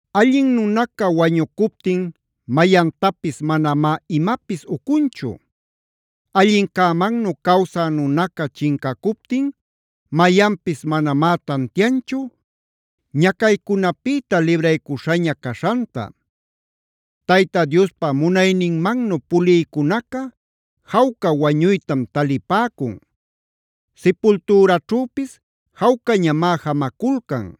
Allin nunaca wañucuptin mayantapis manamá imapis ucunchu. Allincämannu cawsä nunaca chincacuptin mayanpis manamá tantianchu ñacaycunapïta libraycuśhaña caśhanta. Tayta Diospa munayninmannu pulïcunaca jawca wañuytam talipäcun; sipultüraćhüpis jawcañamá jamaculcan.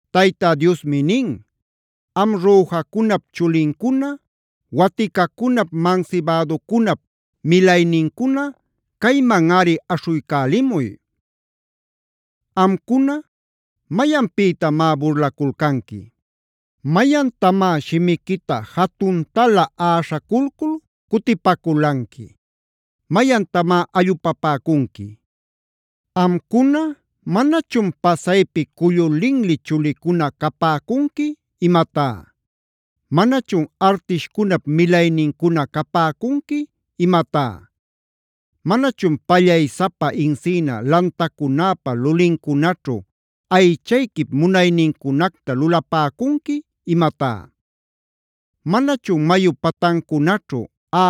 Tayta Diosmi nin: “Am rüjacunap chulincuna, waticacunap, mansibäducunap milaynincuna caymanꞌari aśhuycälimuy. Amcuna, ¿mayanpïtamá burlaculcanqui? ¿Mayantamá shimiquita jatuntalä äśhaculcul cutipaculanqui? ¿Mayantamá allupapäcunqui? Amcuna, ¿manachun pasaypi cullu linli chulicuna capäcunqui imatá? ¿Manachun artishcunap milaynincuna capäcunqui imatá? ¿Manachun pallaysapa encina lantacunäpa lulincunaćhu aychayquip munaynincunacta lulapäcunqui imatá? ¿Manachun mayu patancunaćhu,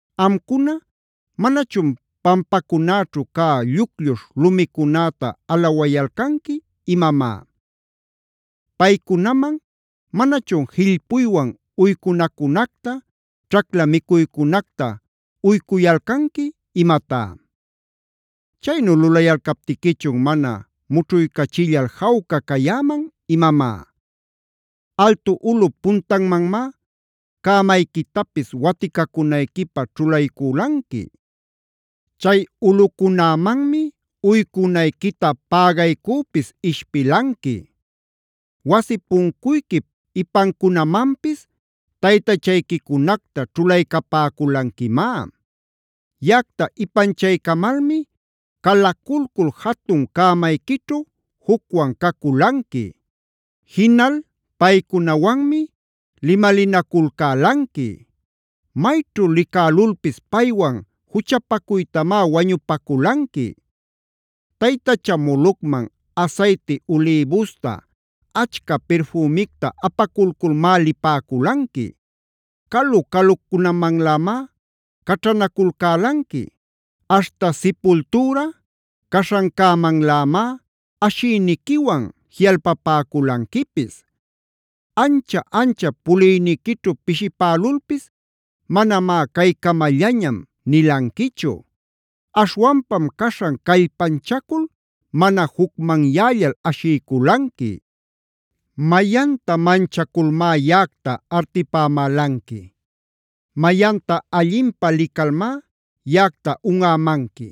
Amcuna ¿manachun pampacunäćhu cä lluclluśhc lumicunäta alawayalcanqui imamá? Paycunaman ¿manachun jillpuywan uycunacunacta, ćhacla micuycunacta uycuyalcanqui imatá? ¿Chaynu lulayalcaptiquichun mana mućhuycachillal jawca cayäman imamá? Altu ulꞌup puntanmanmá cämayquitapis waticacunayquipä ćhulayculanqui; chay ulꞌucunämanmi uycunayquita pägaycüpis ishpilanqui. Wasi puncuyquip ipancunamanpis taytachayquicunacta ćhulaycapäculanquimá. Yaꞌacta ipanchaycamalmi calaculcul jatun cämayquićhu jucwan caculanqui; jinal paycunawanmi limalinaculcälanqui. Mayćhu licälulpis paywan juchapacuytamá wañupaculanqui. “Taytacha Molocman asayti ulïbusta, achca pirfümicta apaculculmá lipäculanqui. Calu calucunamanlämá caćhanaculcälanqui; aśhta sipultüra caśhancämanlämá ashiyniquiwan jiꞌalpapäculanquipis. Ancha-anchap puliyniquićhu pishipälulpis manamá ‘caycamallañam’ nilanquichu. Aśhwanpam caśhan callpanchacul mana jucmanyällal ashiyculanqui. “¿Mayanta manchaculmá yaꞌacta artipämälanqui? ¿Mayanta allinpä licalmá yaꞌacta unꞌämanqui?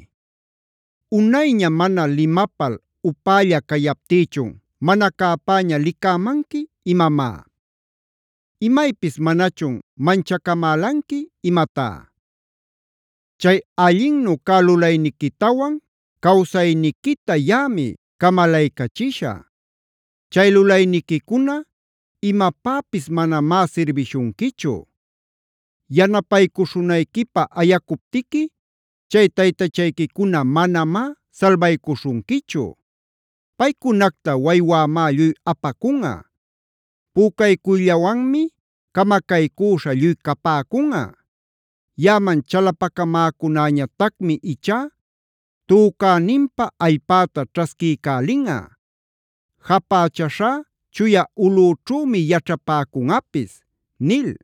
¿Unayña mana limapal upälla cayaptïchun mana cäpäña licämanqui imamá? ¿Imaypis manachun manchacamälanqui imatá? Chay allinnu cä lulayniquitawan cawsayniquita yaꞌami camalaycachishä. Chay lulayniquicuna imapäpis manamá sirbishunquichu. Yanapaycuśhunayquipä ayacuptiqui chay taytachayquicuna manamá salbaycuśhunquichu. Paycunacta waywämá lluy apacunꞌa; pücaycuyllawanmi camacaycüśha lluy capäcunꞌa. Yaꞌaman chalapacamäcunäñatacmi ichá tücäninpä allpäta ćhasquiycälinꞌa; japächäśhá chuya ulꞌüćhümi yaćhapäcunꞌapis” nil.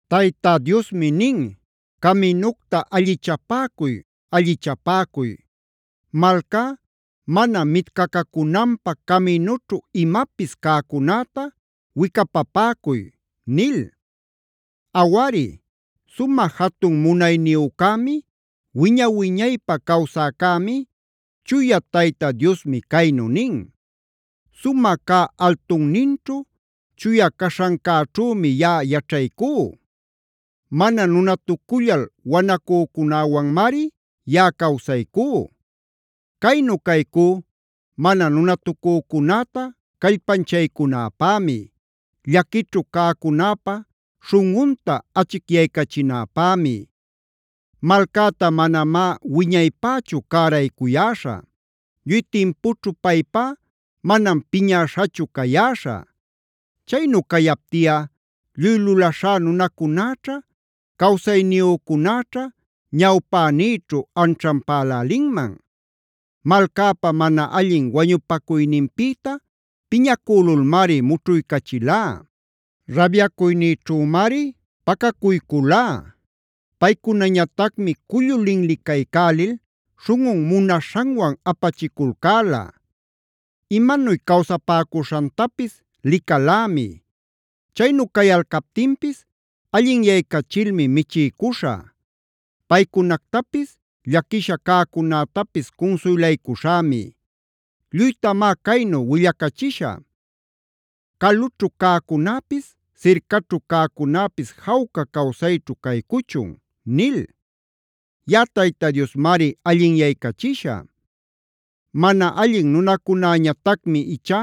Tayta Diosmi nin: “¡Caminucta allichapäcuy, allichapäcuy! ¡Malcá mana mitcacacunanpä caminućhu imapis cäcunäta wicapapäcuy!” nil. Awari, sumä jatun munayniyucämi, wiña-wiñaypä cawsäcämi, Chuya Tayta Diosmi caynu nin: “Sumä cä altunninćhu, chuya caśhancäćhümi yaꞌa yaćhaycú. Mana nunatucullal wanacücäwanmari yaꞌa cawsaycú; caynu caycú mana nunatucücunäta callpanchaycunäpämi; llaquićhu cäcunäpa śhunꞌunta achicyaycachinäpämi. Malcäta manamá wiñaypächu cäraycuyäśhä, lluy timpuchu paypá manam piñäśhachu cayäśhä. Chaynu cayaptiꞌa lluy lulaśhá nunacunäćha, cawsayniyücunäćha ñawpänïćhu anćhanpälälinman. Malcäpa mana allin wañupacuyninpïta piñäcülulmari mućhuycachilá; rabyacuynïćhümari pacacuyculá. Paycunañatacmi cullu linlicaycälil śhunꞌun munaśhanwan apachiculcäla. Imanuy cawsapäcuśhantapis licalämi. Chaynu cayalcaptinpis allinyaycachilmi michiycuśhä. Paycunactapis, llaquisha cäcunätapis cunsuylaycuśhämi. Lluytamá caynu willacachisha: ‘Calućhu cäcunäpis, sircaćhu cäcunäpis jawca cawsayćhu caycuchun’ nil.d Yaꞌa Tayta Diosmari allinyaycachishä. “Mana allin nunacunäñatacmi ichá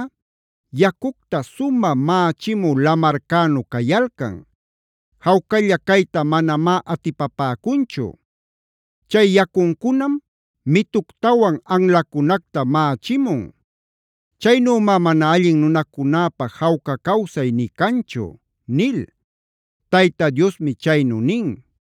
yacucta sumä mächimü lamarcänu cayalcan; jawcalla cayta manamá atipapäcunchu. Chay yacuncunam mituctawan anlacunacta mächimun. Chaynümá mana allin nunacunäpä jawca cawsay nï canchu” nil.e Tayta Diosmi chaynu nin.